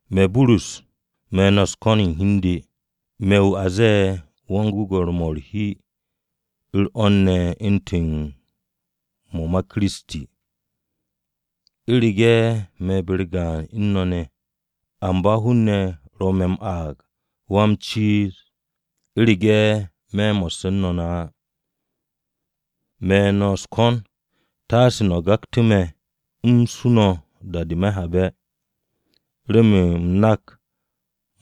Me̱ Burus, me̱ no̱ u̱s-ko̱n u̱n hi u̱n de, me̱ wu̱ a m-ze̱e̱, Yan-gwe̱gwe̱r-mo̱ u̱r-hi, u̱r-'wo̱n ne̱ u̱ntu̱n mo̱ ma Kiristi u̱rege̱ me̱ be-u̱r gaan u̱n no̱ ne̱ à. Amba hun-ne̱ ro̱ me̱ m-aag Wa-m-ciiz, u̱rege̱ me̱ mo̱sse̱ u̱n no̱ ne̱ á. Me̱ no̱ u̱s-ko̱n, taase no̱ gaktu̱ me̱ u̱m suu no̱ da-de me̱ habe̱, remen u̱m nak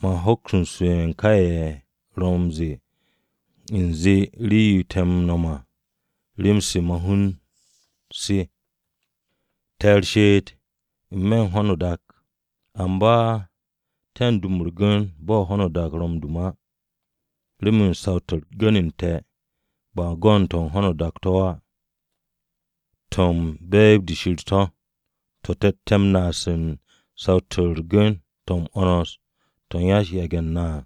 man hoks su'e̱ ka ye̱ ro̱ m-ze̱e̱ u̱nze rii-yo te̱ m-nom à, rem-se ma-hun se. Te̱ u̱r-she'et n-me̱ u̱n ho̱no o-dak, amba te̱ dum u̱r-gu̱n bo̱ ho̱no o-dak ro̱ m-dum á. Remen saw-to̱ u̱r-gu̱n u̱n te̱ ba go̱n to̱ ho̱no o-dak to̱ á, to̱ u̱n be̱e̱b-de Shir to̱, to̱ te̱tte̱ m-naas u̱n saw-to̱ u̱r-gu̱n to̱ m-'wo̱ns to̱ u̱n yan-yage̱-u̱t na.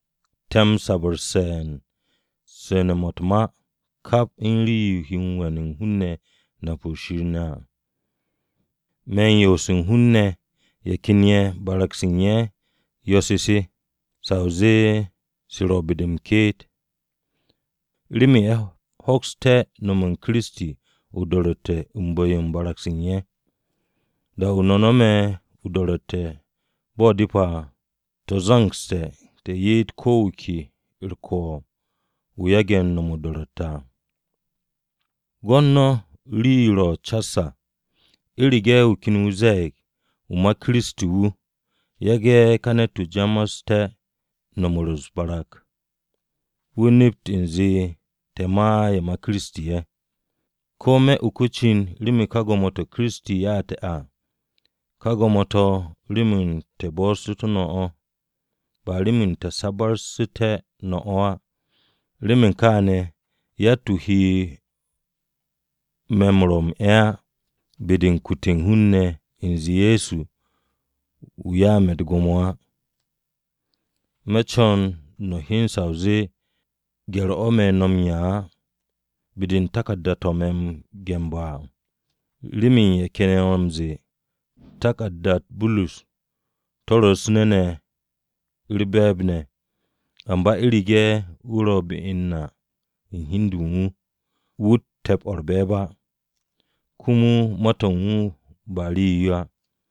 Te̱ m-sabarse̱ u̱n su̱ne̱-mo̱ u̱t-ma kap u̱n rii-yo he m-we̱n hun-ne̱ nap u̱n Shir ne̱ à, me̱n yoose̱ u̱n hun-ne̱ ye̱ 'ke barag-se u̱n ye̱ u̱s-yo̱-se, sa o zee se ro̱ be-de m-ke'et, remen ye̱ hoksté̱ no̱me̱ u̱n Kiristi o-do̱ro̱tte̱ u̱n bu̱-yo u̱n barag-se u̱n ye̱. Da-o̱ no̱ no̱me̱ o-do̱ro̱tte̱ bo̱ depe̱ à, te̱ zo̱ngse̱ te̱ ye'et ko̱ wu̱ ke u̱r-ko̱o̱b wu̱ yage̱ m-no̱m o-do̱ro̱tte̱ à. Gwo̱t no̱ rii-yo ro̱ cas à! U̱rege̱ wu̱ ken ze̱e̱g wu̱, wu̱ ma Kiristi wu̱, yage̱ ka ne̱t-wu̱ ja'aste̱ no̱m u̱s-barag, wu̱a nep u̱nze te̱ ma ye̱ ma Kiristi ye̱. Ko̱ me̱ uke̱ o-cin remen ka gwo̱mo-to̱ Wan-Ko̱yan ya'u̱ te̱ à, ka gwo̱mo-to̱ remen te̱ bo̱'o̱su̱tú̱ no̱ o̱, ba remen te̱ sabarsu̱té̱ no̱ á. Remen kaane̱, yatt-wu̱ he me̱ m-rwo̱ m-'e̱ á, be-de u̱n kute̱ u̱n hun-ne̱ u̱nze Ye̱so wu̱ 'ya me̱ u̱t-gwo̱mo á. Me̱ co̱n no̱ hyen sa o zee gye̱r-o̱ me̱ no̱ m-'ya á be-de u̱n taku̱rda-to̱ me̱ no̱ m-ge̱nbe̱ á. Remen ye̱ ken ye̱ ro̱ m-ze̱e̱, “Taku̱rda-u̱t Burus to̱ ro̱ u̱s-nu̱ ne̱ u̱r-be̱e̱b ne̱, amba u̱rege̱ wu̱ ro̱ be u̱n na u̱n hi u̱n de u̱n wu̱, wu̱tt te̱p-o u̱r-be̱e̱b á, komo ma-to̱ u̱n wu̱ ba rii-yo á.”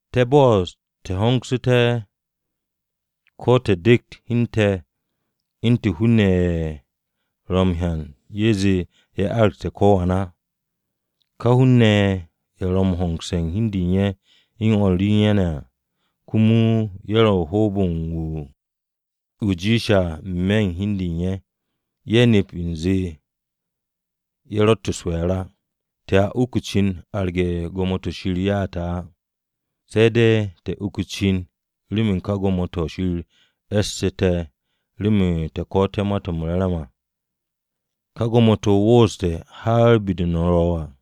Te̱ bo'os te̱ hongsu̱té̱ ko̱ te̱ dekt hi u̱n te̱ u̱ntu̱n hun-ne̱ ye̱ ro̱ m-hyan ye̱ zee ye̱ aragte̱ ko̱ wan á! Ka hun-ne̱ ye̱, ye̱ ro̱ m-hongse̱ hi u̱n de u̱n ye̱ u̱n o̱r re u̱n ye̱ ne̱, komo ye̱ ro̱ u̱n hoob-o̱ u̱n wu̱ jiishe̱ à n-me̱ u̱n hi u̱n de u̱n ye̱, ye̱ nep u̱nze ye̱ ro̱tt u̱s-we̱e̱r á. Te̱a uk o-cin arge̱ gwo̱mo-to̱ Shir ya'u̱ te̱ á, se̱ de̱ te̱ uk o-cin u̱n ka gwo̱mo-to̱ Shir e̱ssu̱tu̱ te̱ remen te̱ ko̱'o̱tté̱ Ma-to̱ m-Re̱re̱m à, ka gwo̱mo-to̱ wooste̱ har be-de no̱ ro̱ à.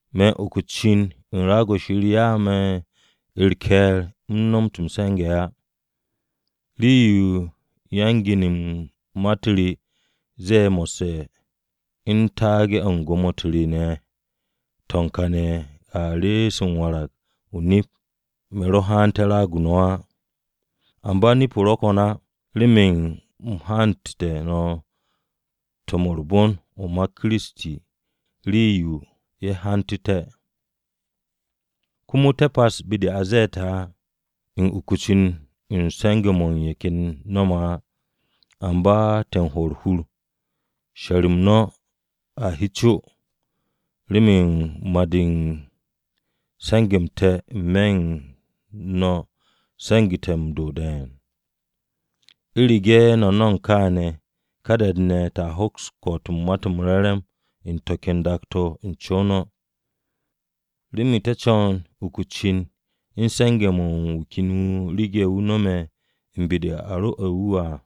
Me̱ u̱n uk o-cin u̱n raag-o̱ Shir ya'u̱ me̱ u̱r-ke̱e̱r u̱m nomot m-se̱nge̱ á. Rii-yo yan-gin u̱n ma-u̱t re ze̱e̱ mo̱sse̱ u̱n taage̱-o̱ u̱n gwo̱mo-u̱t re ne̱ to̱ u̱n kaane̱ a rees m-warag o-nip me̱ ro haante̱ raag-o no̱ á. Amba nip-o ro̱ ko̱n á remen u̱m hantu̱te̱ no̱ Ma-to̱ m-Re̱re̱m o̱ ma Kiristi rii-yo ye̱ hantu̱te̱. Komo te̱ pas be-de a ze̱e̱ te̱ á, u̱n uk o-cin u̱n se̱nge̱-mo̱ ye̱ ken ye̱ no̱me̱ á. Amba te̱ m-hwo̱ u̱r-hur, she̱r-m no̱ a he co, remen ma-de u̱n se̱nge̱-m te̱ n-me̱ u̱n no̱ se̱ngu̱té̱ m-do̱ de̱e̱n. U̱rege̱ no̱ nomog kaane̱, ka da-de te̱a hoks m-ko̱'o̱t u̱n Ma-to̱ m-Re̱re̱m u̱n to̱ ken dak-to̱ n-co no̱. Remen te̱ co̱n uku o-cin u̱n se̱nge̱-mo̱ wu̱ ken wu̱ rege̱ wu̱ nome̱ u̱n be-de a rwo̱'e̱ wu̱ à.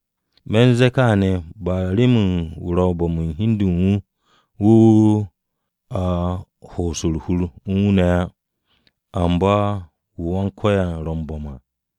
Me̱ u̱n ze̱e̱ kaane̱ remen ba wu̱ ro̱ bo̱m u̱n hi u̱n de u̱n wu̱, wu̱ wu̱ a u̱n ho'os u̱r-hur u̱n wu̱ ne̱ á, amba wu̱ Wan-Ko̱yan ro̱ m-bo̱m à.